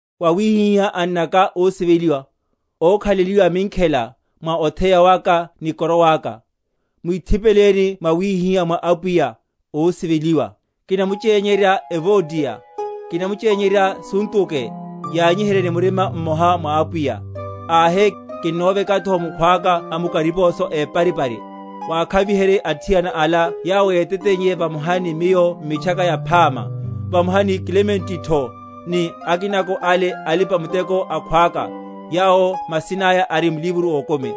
Vawihihá, annaka ósiveliwa, ókhaleliwa minkhela, mwa otheya waka ni koroa aka, mwithipeleni mwawihiha mwa Apwiya, ósiveliwa. Kinamuchényerya Euodiya, kinamuchényerya Suntuke, yanyiherye ni murima mmoha mwa Apwiya. Ahe, kinnovekatho mukhwaka amukariposo éparipari, wakhaviherye athiana ala yawo yéteteiye vamoha ni miyo m’Mitchaka Yaphama, vamoha ni Klementotho, ni akinako ale alipa‐muteko akhwaka, yawo masina aya ari m’livro ókumi.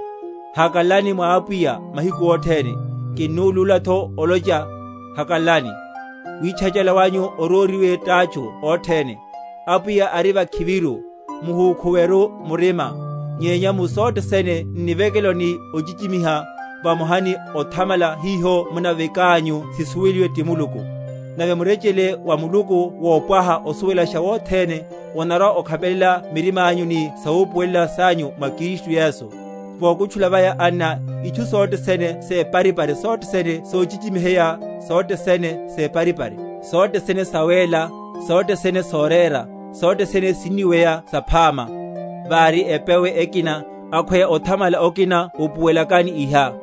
Hakalalani mwa Apwiya mahiku othene: kinnulúlatho olocha, hakalalani. Witchachala wanyu oróriwe tátchu othene. Apwiya ari vakhiviru. Muhúkhuweru m’murima; nyenya mu sothe sene n’nivekelo, ni ochichimiha, vamoha ni othamala, hiho munavekanyu sisuweliwe ti Muluku. Nave murechele wa Muluku wopwaha osuwelasha wothene, onarwa‐okhapelela mirimányu ni sawupuwelela sanyu mwa Kristu Yesu. Vokutchula vaya, anna, itchu sothe sene separipari, sothe sene sochichimiheya, sothe sene separipari, sothe sene sawéla, sothe sene sorera, sothe sene siniweya saphama; vári epewe ekina, akhweya othamala okina upuwelakani iha.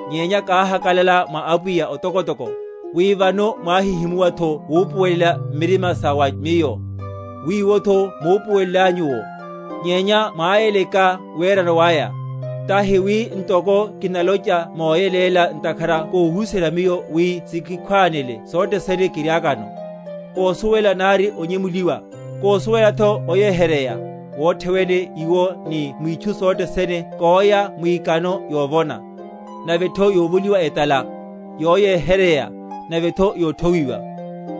Nyenya káhakalala mwa Apwiya otokotoko, wi vano mwáhihimuwatho wupuwelela m’murima sa wa miyo, wiwotho múpuwelenlanyu’wo, nyenya mwáyeleka werano waya. Tahi wi ntoko kinalocha moyeléla, ntakhara kóhuserya miyo, wi sikikhwáne sothe sene kiriakano. Kósuwela nari onyemuliwa, kósuwelatho oyeheryeya, wothe wene iwo ni mwitchu sothe sene kóya mwikano yovona, navetho yovoliwa etala; yoyeheryeya, navetho yothowiwa.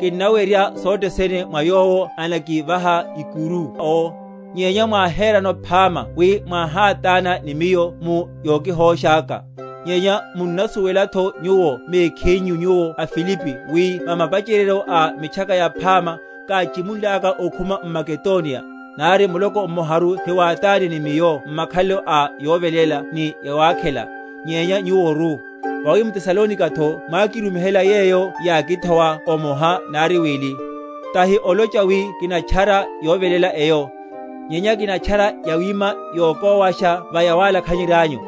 Kinnawerya sothe sene mwa Yowo anakivaha ikuru owo. Nyenya mwáherano phama wi mwáhátána ni miyo mu yokihósháka. Nyenya munnasuwelatho nyuwo mekhinyu, nyuwo aFilipi, wi va mapacheryeryo a Mitchaka Yaphama, káchimunlaka okhuma m’Makedoniya, nari muloko mmoharu hiwátánne ni miyo m’makhalelo a yoveléla ni yawakhela, nyenya nyuworu; vawi m’Tesalonikatho mwákirumihela yeyo yákithowa omoha nari wili. Tahi olocha wi kinatchara yoveléla eyo, nyenya kinatchara yawima yokówasha va yawalakhanyeryányu.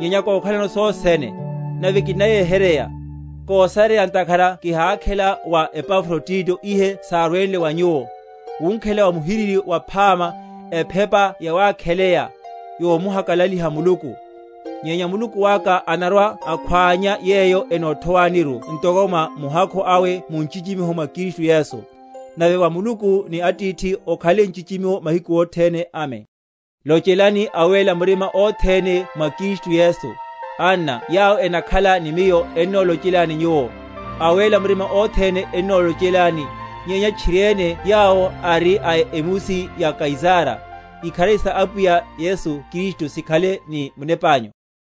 Nyenya kókhalano sothe sene, nave kinnayeheryeya; kósareya, ntakhara kihákhela wa Epafrodito ihe sárwele wa nyuwo, wunkhela wa muhiriri waphama, ephepa yawakheleya, yomuhakalaliha Muluku. Nyenya Muluku aka anarwa‐akhwánya yeyo enothowaniru ntoko mwa muhakhu awe mu nchichimiho mwa Kristu Yesu. Nave wa Muluku ni Atithihu okhale nchichimiho mahiku othene. Amen. Lochelani awéla murima othene mwa Kristu Yesu, anna yawo enakhala ni miyo ennolochelani nyuwo. Awéla murima othene ennolochelani, nyenya tchiriene yawo ari a emusi ya Kaisara. Ikharari sa Apwiya Yesu Kristu sikhale ni munepányu.